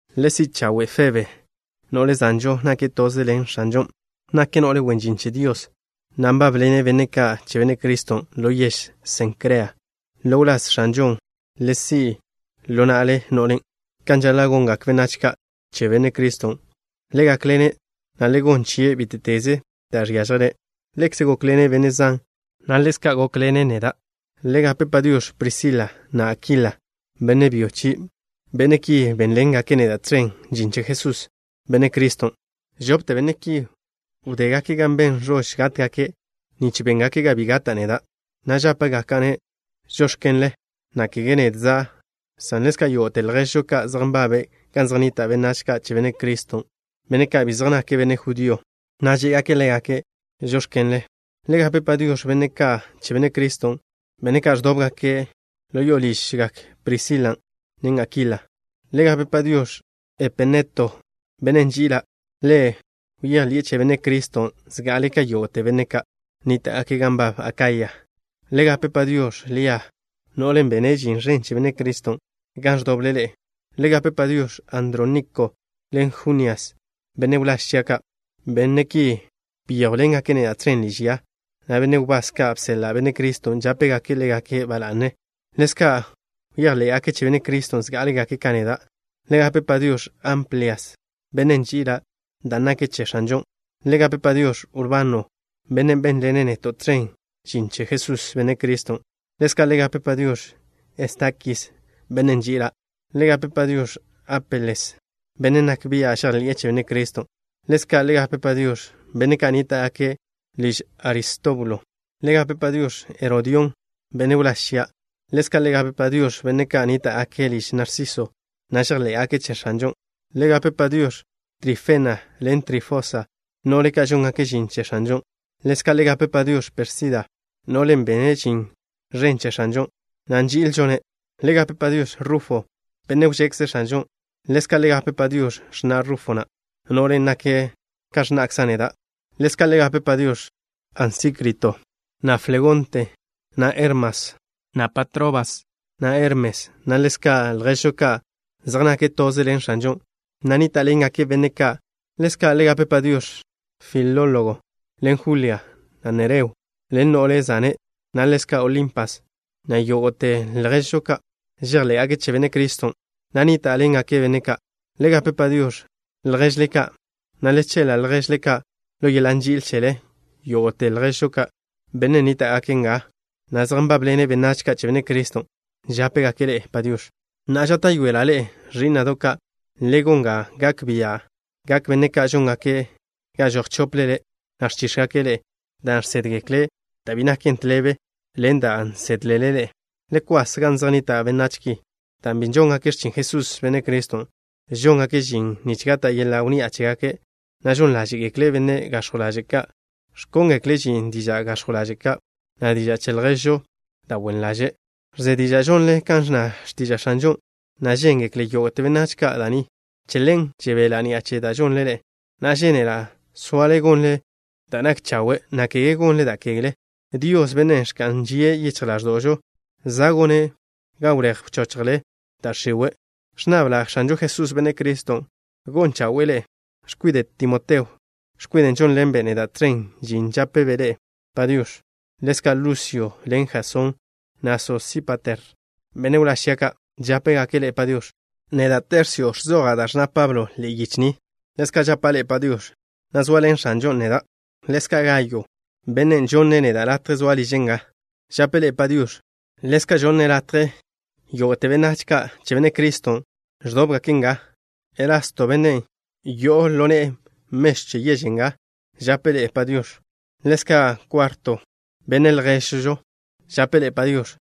Le si' chawe' Febe, no'le zanžon' nake' toze ḻen X̱anžon'. Nake' no'le wen žin che Dios, na' nbábḻene' benne' ka' che Benne' Criston' ḻo yež Sencrea. Ḻo wláz X̱anžon' le si' ḻo na'le no'len', kan žaḻa' gongak benách ka' che Benne' Criston'. Le gákḻene', na' le gonn chie' bíte'teze da' žiážjelen'. Ḻekze' gókḻene' benne' zan, na' ḻezka' gókḻene' neda'. Le gape “Padiox̱” Prisila, na' Akila, benne' byo chie'. Benne' ki bénḻengake' neda' tẕen žin che Jesús, Benne' Criston'. Žopte benne' ki wdégake' gan ben ẕož gátgake' nich béngake' ga bi gata' neda', na' žápegaka'-ne': “Žóx̱kenle” na' kege nedza', san ḻezka' yógo'te lježžo ka' zej nbabe' gan zej nnita' benách ka' che Benne' Criston', benne' ka' bi zej nake' benne' judío ka', žé'gake' ḻégake': “Žóx̱kenle.” Le gape “Padiox̱” benne' ka' che Benne' Criston', benne' ka' ẕdóbgake' ḻo ližgak Prisilan', na' Akilan'. Le gape “Padiox̱” Epeneto, bennen' nži'ila'. Ḻe' bejḻi'e che Benne' Criston' zga'ale' ka yógo'te benne' ka' nníta'gake' gan nbab Akaya. Le gape “Padiox̱” Lia, no'len' bene' žin ẕen che Benne' Criston' gan ẕdoble ḻe'e. Le gape “Padiox̱” Andróniko ḻen Junias, benne' wláž chia' ka'. Benne' ki byéjwḻengake' neda' tẕen liž ya, na' benne' wbás ka' bseḻa' Benne' Criston' žápegake' ḻégake' ba la'ne. Ḻezka' bejḻé'gake' che Benne' Criston' zgá'alegake' ka neda'. Le gape “Padiox̱” Amplias, bennen' nži'ila' dan' nake' che X̱anžon'. Le gape “Padiox̱” Urbano, bennen' bénḻene' neto' tẕen žin che Jesús, Benne' Criston'. Ḻezka' le gape “Padiox̱” Estakis, bennen' nži'ila'. Le gape “Padiox̱” Apeles, bennen' nak bia' žejḻi'e che Benne' Criston'. Ḻezka' le gape “Padiox̱” benne' ka' nníta'gake' liž Aristóbulo. Le gape “Padiox̱” Herodión, benne' wláž chia'. Ḻezka' le gape “Padiox̱” benne' ka' nníta'gake' liž Narsiso, na' žejḻé'gake' che X̱anžon'. Le gape “Padiox̱” Trifena ḻen Trifosa, no'le ka' žóngake' žin che X̱anžon'. Ḻezka' le gape “Padiox̱” Pérsida, no'len' bene' žin ẕen che X̱anžon', na' nži'ilžo-ne'. Le gape “Padiox̱” Rufo, benne' wžekze X̱anžon'. Ḻezka' le gape “Padiox̱” x̱na' Rufo na', no'len' nake' ka x̱na'kza' neda'. Ḻezka' le gape “Padiox̱” Asíncrito, na' Flegonte, na' Hermas, na' Patrobas, na' Hermes, na' ḻezka' lježžo ka' zej nake' toze ḻen X̱anžon', na' nníta'ḻengake' benne' ka'. Ḻezka' le gape “Padiox̱” Filólogo ḻen Julia, na' Nereo ḻen no'le zane', na' ḻezka' Olimpas, na' yógo'te lježžo ka' žejḻé'gake' che Benne' Criston', na' nníta'ḻengake' benne' ka'. Le gape “Padiox̱” lježle ka', na' le cheḻa' lježle ka' ḻo yeḻa' nži'il chele. Yógo'te lježžo ka', benne' nníta'gake' nga, na' zej nbábḻene' benách ka' che Benne' Criston', žápegake' ḻe'e “Padiox̱”. Na'a, žáta'yoela' ḻe'e, ẕí'na'do' ka', le gon ga gak bia'gak benne' ka' žóngake' ga žoj chóplele, na' ẕchíx̱gake' ḻe'e, dan' žsédgekle' da' bi naken tḻebe ḻen da' nsedle ḻe'e. Le kwas gan zej nnita' benách ki, dan' bi žóngake' x̱chin Jesús, Benne' Criston'. Žóngake' žin nich gata' yeḻa' wnni'a chégake', na' žon ḻáže'gekle' benne' gax̱jw ḻaže' ka', ẕkóngekle' žin diža' gax̱jw ḻaže' ka', na' diža' chejḻe'žo da' wen ḻaže'. Ẕze diža' žonle kan ẕnna x̱tiža' X̱anžon', na' žéngekle yógo'te benách ka' da' ni. Che ḻen žebela' ni'a che da' žonle ḻe'e. Na'a, žénela' soale gonle da' nak chawe', na' kege gonle da' kegle. Dios, Bennen' ẕka'n žie' yichj ḻáẕdo'žo, za' gone' ga wléj wchochjle da' x̱iwe'. Ẕnnabla' X̱anžo Jesús, Benne' Criston', gon chawe'e ḻe'e. X̱kwide' Timoteo, x̱kwiden' žónḻenbe' neda' tẕen žin, žápebe' ḻe'e “Padiox̱.” Ḻezka' Lusio ḻen Jasón, na' Sosípater, benne' wláž chia' ka', žápegake' ḻe'e “Padiox̱.” Neda', Tersio, ẕzoja' da' ẕnna Pablo ḻe'e yiche ni, ḻezka' žapa' ḻe'e “Padiox̱” na' zoaḻen X̱anžon' neda'. Ḻezka' Gayo, bennen' žonne' neda' latje zoa' liže' nga, žape' ḻe'e “Padiox̱.” Ḻezka' žonne' latje yógo'te benách ka' che Benne' Criston' ẕdóbgake' nga. Erasto, benne' yo'o ḻo ne'e mežw che yež nga žape' ḻe'e “Padiox̱.” Ḻezka' Kuarto, benne' lježžo, žape' ḻe'e “Padiox̱.”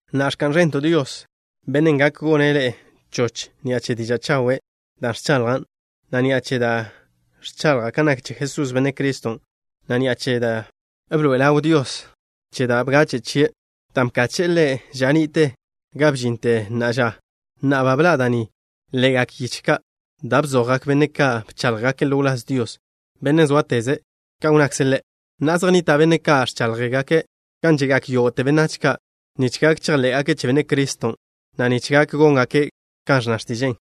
Na'a, ¡ẕka'n ẕento' Dios, Bennen' gak gone' ḻe'e choch ni'a che diža' chawe' da' ẕchaḻjan', na' ni'a che da' ẕchaḻja' kan nak che Jesús, Benne' Criston', na' ni'a che da' bḻoe'e ḻaw Dios che da' bgache' chie', dan' bkache'e Ḻe' ža ni'te ga bžinte na'a ža! Na'a ba bḻa' da' ni ḻe'egak yiche ka' da' bzojgak benne' ka' bcháḻjgake' ḻo wláz Dios, Bennen' zóateze', kan wnnakze' Ḻe'. Na'a zej nnita' benne' ka' ẕcháḻjgaken' gan že'gak yógo'te benách ka' nich gak chejḻé'gake' che Benne' Criston', na' nich gak góngake' kan ẕnna x̱tiže'e.